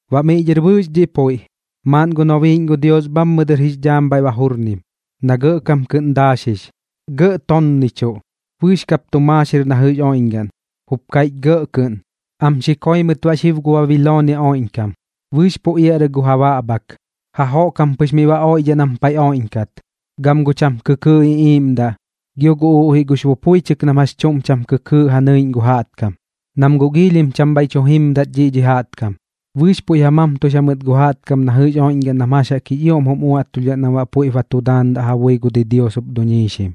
Baꞌ miꞌ dhɨr bɨɨx dhiꞌ puiꞌ, maaꞌn gu nobiiꞌñ gu Dios bhammɨ dɨr jix dhaam bhaiꞌ ba jurnim, na gɇꞌkam kɨꞌn daaxix, gɇꞌ tonnichuꞌ, bɨɨx kap tu maaxir na jɨꞌx oiꞌñgaꞌn, jup kaiꞌchim gɇꞌ kɨꞌn: ―Am xi koi mɨt baꞌ xib gu Babiloonia oiꞌñkam. Bɨɨx pu iaꞌrɨ gu ja baꞌbhak, jajoꞌk jam pɨx miꞌ ba oiꞌdhaꞌ nam paiꞌ oiꞌñkat, gam gu cham kɨkɨɨꞌ iꞌiiꞌmdaꞌ, gio gu uꞌjiꞌ gux bupuichɨk nam jax chuꞌm cham kɨkɨɨꞌ ja nɨiꞌñ gu jaꞌtkam. Nam guꞌ giilhim cham bhaiꞌ tu jimdat dhiꞌ dhi jaꞌtkam, bɨɨx puiꞌ ja mamtux jamɨt gu jaꞌtkam na jɨꞌx oiꞌñgaꞌn nam jax jaꞌk jix ioꞌm jum uaꞌtulhdhaꞌ nam baꞌ puiꞌp ba tu daandaꞌ ja bui gu didios jup duñiixim,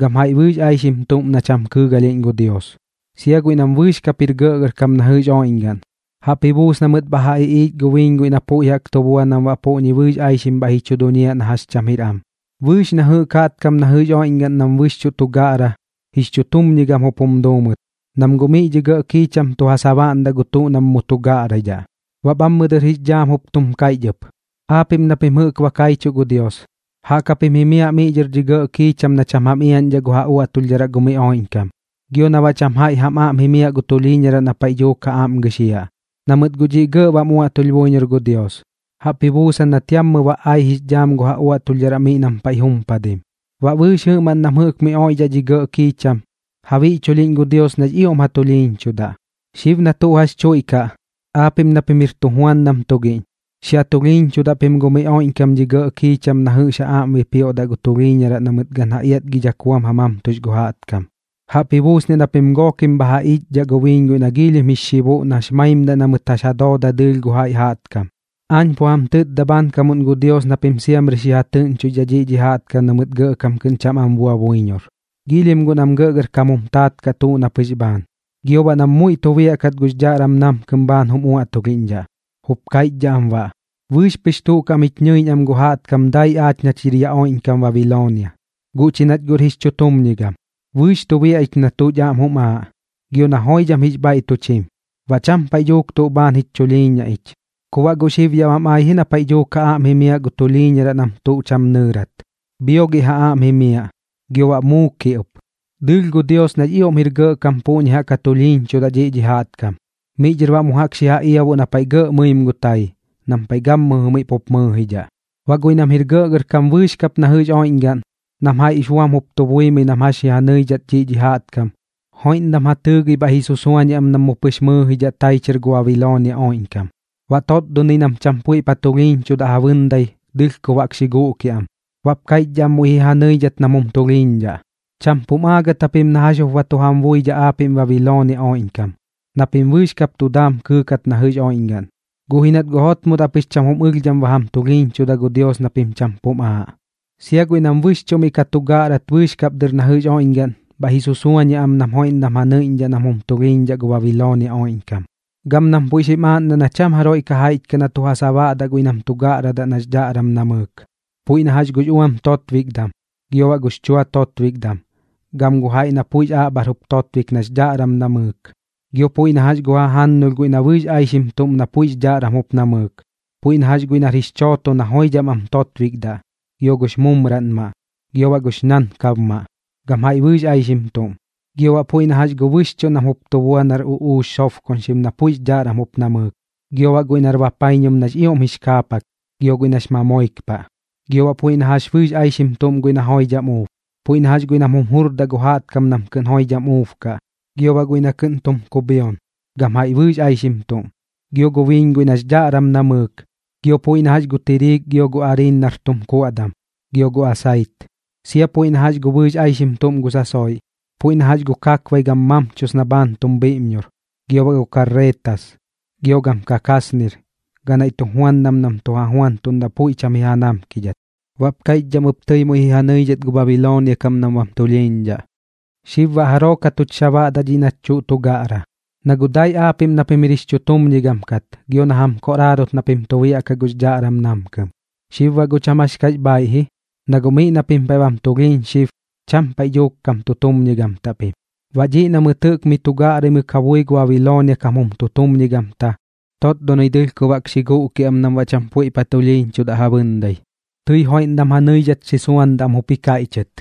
gam jaiꞌ bɨɨx aixim tuꞌm na cham kɨɨgalhiꞌñ gu Dios, sia guiꞌ nam bɨɨx kap jir gɇꞌgɇrkam na jɨꞌx oiꞌñgaꞌn. Jaꞌp ji buus na mɨt bha ja iꞌiich gu biiñ guiꞌ na puiꞌ jaꞌk tu bua nam baꞌ puꞌñi bɨɨx aixim bhaiꞌ ji chu duñiaꞌ na jax cham jir am. Bɨɨx na jɨꞌk jaꞌtkam na jɨꞌx oiꞌñgaꞌn nam bɨxchuꞌ tu gaꞌra, jix chutumñigam jup jum duu mɨt, nam guꞌ miꞌ dhi gɇꞌ kiicham tu ja sabaꞌndaꞌ gu tuꞌ nam mu tu gaꞌraidhaꞌ. Baꞌ bhammɨ dɨr jix dhaam jup tum kaiꞌch ɨp: ―Aapiꞌm na pim jɨꞌk ba kaichuꞌ gu Dios, jaꞌk japim jimiaꞌ miꞌ dhɨr dhi gɇꞌ kiicham na cham jam iaꞌñdhaꞌ gu ja uaꞌtulhdharaꞌ gu miꞌ oiꞌñkam, gio na baꞌ cham jaiꞌ jam daam jimiaꞌ gu tulhiiñaraꞌ na paiꞌ dhuuk ja aꞌm gɨxiaꞌ. Na mɨt guꞌ dhiꞌ giilhim gɇꞌ bam uaꞌtulh buiñor gu Dios, jaꞌp ji buusan nat yammɨ ba ai jix dhaam gu ja uaꞌtulhdharaꞌ miꞌ nam paiꞌ jumpadim. Baꞌ bɨɨx jɨꞌmaꞌn nam jɨꞌk miꞌ oiꞌdhaꞌ dhi gɇꞌ kiicham, ja biꞌchulhiꞌñ gu Dios nax ioꞌm ja tulhiiñchudaꞌ. Xib na tuꞌ jax tuiꞌkaꞌ, aapiꞌm na pim jir tujuandam tugiꞌñ, xi ja tulhiiñchudaꞌ pim gu miꞌ oiꞌñkam dhi gɇꞌ kiicham na jɨꞌx ja aꞌm bipioꞌ gu tulhiiñaraꞌ na mɨt gan ja iatgidhak buam ja mamtux gu jaꞌtkam, jaꞌp ji buusniaꞌ na pim gookim bha ja iꞌchdhaꞌ gu biiñ guiꞌ na giilhim jix xibuꞌ nax maimdaꞌ na mɨt jax ja dooda dɨɨlh gu jaiꞌ jaꞌtkam. Aañ pu jam tɨtda bhaankamuꞌn gu Dios na pim siamri xi ja tɨꞌñchoixdhaꞌ dhiꞌ dhi jaꞌtkam na mɨt gɇꞌkam kɨꞌn cham am bua buiñor, giilhim guꞌ nam gɇꞌgɇrkam jum taat kaꞌ tuꞌ na pɨx bhaan, gio baꞌ nam muiꞌ tu biaꞌkat gux dhaꞌram namkɨm bhaan jum uaꞌtulhiꞌñdhaꞌ, jup kaiꞌchdhaꞌ am baꞌ: “Bɨɨx pɨx tuꞌ kaꞌm jich ñɨiꞌñ am gu jaꞌtkam dai aach nach jir yaꞌ oiꞌñkam Babiloonia, guꞌ chi nach guꞌr jix chutumñigam. Bɨɨx tu biaꞌ ich na tuꞌch aꞌm jum aaꞌ, gio na joidham jix bhaiꞌ tuch jim. Baꞌ cham paiꞌ dhuuk tuꞌ bhaan jich chulhiiñaꞌ ich.” Ku baꞌ guꞌ xib yaꞌ bam ai ji na paiꞌ dhuuk ja aꞌm jimiaꞌ gu tulhiiñaraꞌ nam tuꞌ cham nɨɨrat. Bhiogiꞌ ja aꞌm jimiaꞌ, gio baꞌ muukiꞌ ɨp. Dɨɨlh gu Dios nax ioꞌm jir gɇꞌkam puꞌñi jaꞌk ja tulhiiñchudaꞌ dhiꞌ dhi jaꞌtkam, miꞌ dhɨr baꞌ mu jaꞌk xi ja iabuꞌ na paiꞌ gɇꞌ mɨim gu tai, nam paiꞌ gammɨjɨ miꞌ pup mɨɨjidhaꞌ. Baꞌ guiꞌ nam jir gɇꞌgɇrkam bɨɨx kap na jɨꞌx oiꞌñgaꞌn, nam jaiꞌ puiꞌx buam jup tu buimɨi nam jax ji ja nɨidhat dhiꞌ dhi jaꞌtkam, joiꞌndam ja tɨɨgɨi bhaiꞌ ji susuañiaꞌ am nam mu pɨx mɨɨjidhaꞌ tai chɨr gu Babiloonia oiꞌñkam. Baꞌ totdonɨi nam cham puiꞌp ja tulhiiñchudaꞌ ja bɨndai, dɨlhkob jaꞌk xi guꞌkiaꞌ am, baꞌp kaiꞌchdhaꞌ am muiꞌ ji ja nɨidhat nam jum tulhiiñdhaꞌ: ―Cham pum aagɨt japim na jax jup ba tu jam buidhaꞌ aapiꞌm Babiloonia oiꞌñkam, na pim bɨɨx kap tu daam kɨɨkat na jɨꞌx oiꞌñgaꞌn, guꞌ ji nat guꞌ jotmodaꞌ pɨx cham jum ɨlhdham ba jam tulhiiñchuda gu Dios na pim cham pum aaꞌ. Sia guiꞌ nam bɨxchuꞌ miꞌ ka tu gaꞌrat bɨɨx kap dɨr na jɨꞌx oiꞌñgaꞌn, bhaiꞌ ji susuañiaꞌ am nam joiꞌndam ja nɨiꞌñdhaꞌ nam jum tulhiiñdhaꞌ gu Babiloonia oiꞌñkam, gam nam puiꞌ xim aaꞌndaꞌ na cham jaroiꞌ ka jaiꞌch kaꞌ na tu ja sabaꞌdaꞌ guiꞌ nam tu gaꞌra nax dhaꞌram namɨɨk. Puiꞌ na jax gux uam totbikdam, gio baꞌ gux chua totbikdam, gam gu jaiꞌ na puiꞌx aꞌbhar jup totbik nax dhaꞌram jup namɨɨk. Gio puiꞌ na jax gu jajannulh guiꞌ na bɨɨx aixim tuꞌm na puiꞌx dhaꞌram jup namɨɨk, puiꞌ na jax guiꞌ nar jix chooto na joidham am totbikdaꞌ, gio gux mumraꞌnmaꞌ, gio baꞌ gux ñankabmaꞌ, gam jaiꞌ bɨɨx aixim tuꞌm. Gio baꞌ puiꞌ na jax gu bɨxchuꞌ nam jup tu bua nar uꞌuux sobkoñxim na puiꞌx dhaꞌram jup namɨɨk, gio baꞌ guiꞌ nar bapaiñum nax ioꞌm jix kaapak, gio guiꞌ nax mamoik paꞌ. Gio baꞌ puiꞌ na jax bɨɨx aixim guiꞌ na joidham uub, puiꞌ na jax guiꞌ nam jum jurdaꞌ gu jaꞌtkam nam kɨꞌn joidham uubkaꞌ, gio baꞌ guiꞌ nam kɨꞌn tum kubhion, gam jaiꞌ bɨɨx aixim tuꞌm. Gio gu biiñ guiꞌ nax dhaꞌram namɨɨk, gio puiꞌ na jax gu tiriik gio gu ariin nar tum kuaꞌdam, gio gu asait. Sia puiꞌ na jax gu bɨɨx aixim tuꞌm gu sasoiꞌ, puiꞌ na jax gu kakbai gam mamchus na bhaan tum bhiiꞌmñor, gio baꞌ gu karretas, gio gam kakasnir, ganaiꞌ tujuandam nam tu ja juantuꞌndaꞌ puiꞌ cham ji ja namkidhat. Baꞌp kaiꞌchdhaꞌ am ɨp tɨi muiꞌ ji ja nɨidhat gu Babiloonia kam nam bam tulhiiñdhaꞌ: ―¿Xib baꞌ jaroo ka tuch sabaꞌdaꞌ dhiꞌ nach tuꞌ tu gaꞌra? Na guꞌ dai aapiꞌm na pim jir jix chutumñigam kat gio na jam koꞌraarot na pim tu biaꞌkaꞌ gux dhaꞌram namkɨm. Xib baꞌ guꞌ cham jax kax bhaaiꞌ ji, na guꞌ miꞌ na pim paiꞌ bam tulhiiñ xib, cham paiꞌ dhuuk kam tutumñigamtaꞌ pim. Baꞌ dhiꞌ na mɨt jɨꞌk miꞌ tu gaꞌraimɨk ja bui gu Babiloonia kam jum tutumñigamta, totdonɨi dɨlhkob jaꞌk xi guꞌkiaꞌ am nam baꞌ cham puiꞌp ja tulhiiñchudaꞌ ja bɨndai, tɨi joiꞌndam ja nɨidhat xi suandaꞌ am jup ji kaiꞌchɨt: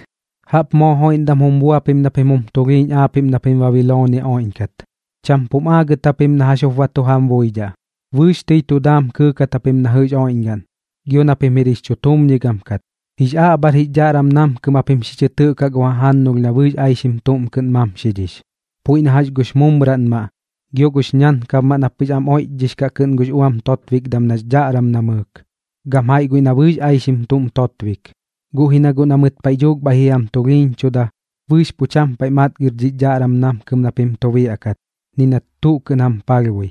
―¡Jaꞌp moo joiꞌndam jup bua pim na pim jum tulhiiñ aapiꞌm na pim Babiloonia oiꞌñkat! Cham pum aagɨt japim na jax jup ba tu jam buidhaꞌ. Bɨɨx tɨi tu daam kɨɨkat japim na jɨꞌx oiꞌñgaꞌn, gio na pim jir jix chutumñigam kat, jix aꞌbhar jix dhaꞌram namkɨm japim xi chɨ tɨꞌkaꞌ gu jajannulh na bɨɨx aixim tuꞌm kɨꞌn mamxidhix, puiꞌ na jax gux mumraꞌnmaꞌ, gio gux ñankabmaꞌ na pɨx am oiꞌchdhix kaꞌ kɨꞌn gux uam totbikdam nax dhaꞌram namɨɨk, gam jaiꞌ guiꞌ na bɨɨx aixim tuꞌm totbik. Guꞌ ji na guꞌ na mɨt paiꞌ dhuuk bhaiꞌ ji jam tulhiiñchuda, bɨɨx pu cham paiꞌ matgir dhix dhaꞌram namkɨm na pim ka tu biaꞌkat, ni nat tuꞌ kɨꞌn jam palhbui.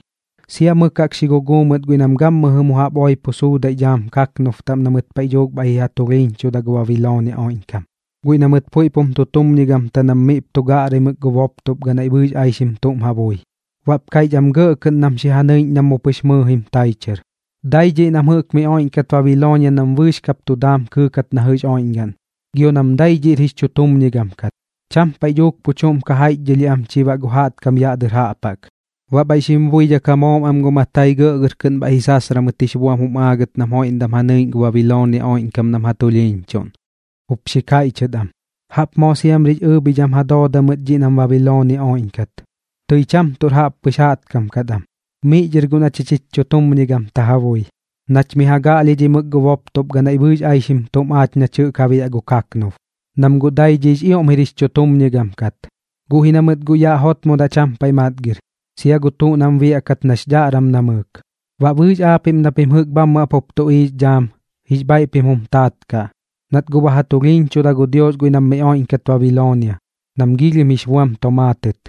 Sia mɨk jaꞌk xi guguu mɨt guiꞌ nam gammɨjɨ mu jaꞌp oipo suudaiꞌ dhaam kaknub taꞌm na mɨt paiꞌ dhuuk bhaiꞌ ji ja tulhiiñchuda gu Babiloonia oiꞌñkam, guiꞌ na mɨt puiꞌp jum tutumñigamta nam miꞌp tu gaꞌraimɨk gu boptop ganaiꞌ bɨɨx aixim tuꞌm ja bui. Baꞌp kaiꞌch am gɇꞌ kɨꞌn nam xi ja nɨiꞌñ na mu pɨx mɨɨjim tai chɨr: ―Dai dhiꞌ nam jɨꞌk miꞌ oiꞌñkat Babiloonia nam bɨɨx kap tu daam kɨɨkat na jɨꞌx oiꞌñgaꞌn, gio nam dai dhiꞌr jix chutumñigam kat. Cham paiꞌ dhuuk pu chuꞌm ka jaiꞌchdhɨlhiaꞌ am chi baꞌ gu jaꞌtkam yaꞌ dɨr jaꞌp jaꞌk. Baꞌ bhaiꞌ xim buidhak ja moom am gu matai gɇꞌgɇr kɨꞌn bhaiꞌ ji sasra mɨt jix buam jum aagɨt nam joiꞌndam ja nɨiꞌñ gu Babiloonia oiꞌñkam nam ja tulhiiñchuꞌn, jup xi kaiꞌchɨt am: ―¡Jaꞌp moo siamrix ɨɨbhidham ja dooda mɨt dhiꞌ nam Babiloonia oiꞌñkat! Tɨi cham tuꞌr jaꞌppɨx jaꞌtkam kat am. Miꞌ dhɨr guꞌ na chich jich chutumñigamta guiꞌ ja bui, nach miꞌ ja gaꞌlhidhimɨk gu boptop ganaiꞌ bɨɨx aixim tuꞌm aach nach jɨꞌk ja biaꞌ gu kaknub, nam guꞌ dai dhiꞌx ioꞌm jir jix chutumñigam kat. Guꞌ ji na mɨt guꞌ yaꞌ jotmodaꞌ cham paiꞌ matgir, sia gu tuꞌ nam biaꞌkat nax dhaꞌram namɨɨk. Baꞌ bɨɨx aapiꞌm na pim jɨꞌk bhammɨ jaꞌp jup tuꞌiiꞌx dhaam, jix bhaiꞌ pim jum taat kaꞌ, nat guꞌ ba ja tulhiiñchuda gu Dios guiꞌ nam miꞌ oiꞌñkat Babiloonia, nam giilhim jix buam tomaatɨt.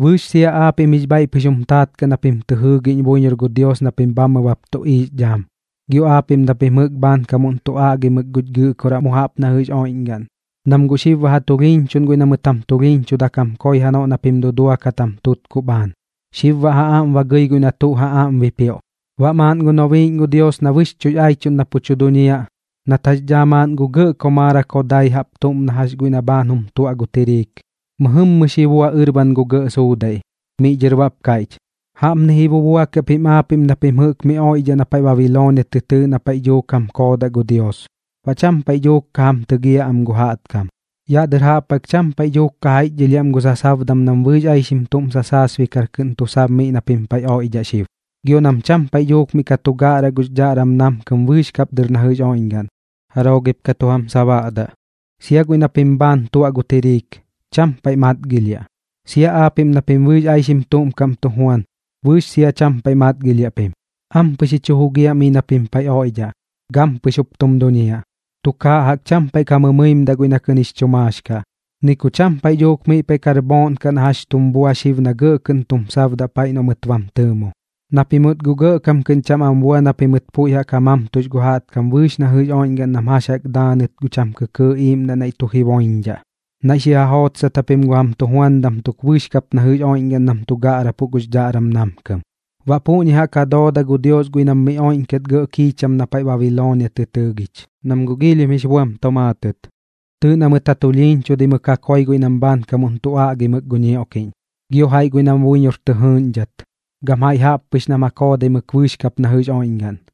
Bɨɨx sia aapiꞌm jix bhaiꞌ pɨx jum taat kaꞌ na pim tɨ jɨɨgiꞌñ buiñor gu Dios na pim bhammɨ bap tuꞌiiꞌx dhaam, gio aapiꞌm na pim jɨꞌk bhaankamuꞌn tu aꞌgimɨk guch Gɨꞌkoraꞌ mu jaꞌp na jɨꞌx oiꞌñgaꞌn, na guꞌ xib ba ja tulhiiñchuꞌn guiꞌ na mɨt jam tulhiiñchudak jam koi janoꞌ na pim duduakat gu jam tutkuꞌ bhaan. Xib baꞌ ja aꞌm ba gɨi guiꞌ na tuꞌ ja aꞌm bipioꞌ. Baꞌ maaꞌn gu nobiiꞌñ gu Dios na bɨxchuꞌx aichuꞌn na pu tu duñiaꞌ, nat jax daa maaꞌn gu gɇꞌ komaarak jodai jaꞌp tuꞌm na jax guiꞌ na kɨꞌn jum tuaꞌ gu tiriik, mɨjɨmmɨ xi bua ɨrban gu gɇꞌ suudaiꞌ, miꞌ dhɨr baꞌp kaiꞌch: ―Jaꞌpni ji bubuakiaꞌ pim aapiꞌm na pim jɨꞌk miꞌ oiꞌdhaꞌ na paiꞌ Babiloonia tɨ tɨɨꞌ na paiꞌ dhuuk jam koodaꞌ gu Dios, baꞌ cham paiꞌ dhuuk ka jam tɨgiaꞌ am gu jaꞌtkam. Yaꞌ dɨr jaꞌp jaꞌk cham paiꞌ dhuuk ka jaiꞌchdhɨlhiaꞌ am gu sasabdam nam bɨɨx aixim tuꞌm sasaasbikar kɨꞌn tu sab miꞌ na pim paiꞌ oiꞌdhaꞌ xib, gio nam cham paiꞌ dhuuk miꞌ ka tu gaꞌraꞌ gux dhaꞌram namkɨm bɨɨx kap dɨr na jɨꞌx oiꞌñgaꞌn. ¿Jaroo gip ka tu jam sabaꞌdaꞌ? Sia guiꞌ na pim bhaan tuaꞌ gu tiriik, cham paiꞌ matgilhiaꞌ, sia aapiꞌm na pim bɨɨx aixim tuꞌm kaꞌm tu juan, bɨɨx sia cham paiꞌ matgilhiaꞌ pim. Ampɨx ji chu jugiaꞌ miꞌ na pim paiꞌ oiꞌdhaꞌ, gampɨx jup tum duñiaꞌ. Tukaaꞌ jaꞌk cham paiꞌ ka mɨimdaꞌ guiꞌ na kɨꞌn jix chu maax kaꞌ, ni ku cham paiꞌ dhuuk miꞌ paiꞌ kar bhooꞌn kaꞌ na jax chum bua xib na gɇꞌ kɨꞌn tum sabdaꞌ paiꞌ noꞌ mɨt bam tɨɨmo, na pimɨt guꞌ gɇꞌkam kɨꞌn cham am bua na pimɨt puiꞌ ja mamtux gu jaꞌtkam bɨɨx na jɨꞌx oiꞌñgaꞌn nam jax jaꞌk ja daanɨt gu cham kɨkɨɨꞌ iꞌiiꞌmdaꞌ naiꞌ tu jiboiñdhaꞌ. Naiꞌ xi ja jootsat japim gu jam tujuandam tuk bɨɨx kap na jɨꞌx oiꞌñgaꞌn nam tu gaꞌrapuꞌ gux dhaꞌram namkɨm. Baꞌ puꞌñi jaꞌk ja dooda gu Dios guiꞌ nam miꞌ oiꞌñkat gɇꞌ kiicham na paiꞌ Babiloonia tɨ tɨɨgich, nam guꞌ giilhim jix buam tomaatɨt. Tɨɨꞌ na mɨt ja tulhiiñchudaimɨk ja koi guiꞌ nam bhaankamuꞌn tu aꞌgimɨk gu ñioꞌkiꞌñ, gio jaiꞌ guiꞌ nam buiñor tɨ jɨɨꞌñdhat, gam jaiꞌ jaꞌppɨx nam ja koodaimɨk bɨɨx kap na jɨꞌx oiꞌñgaꞌn.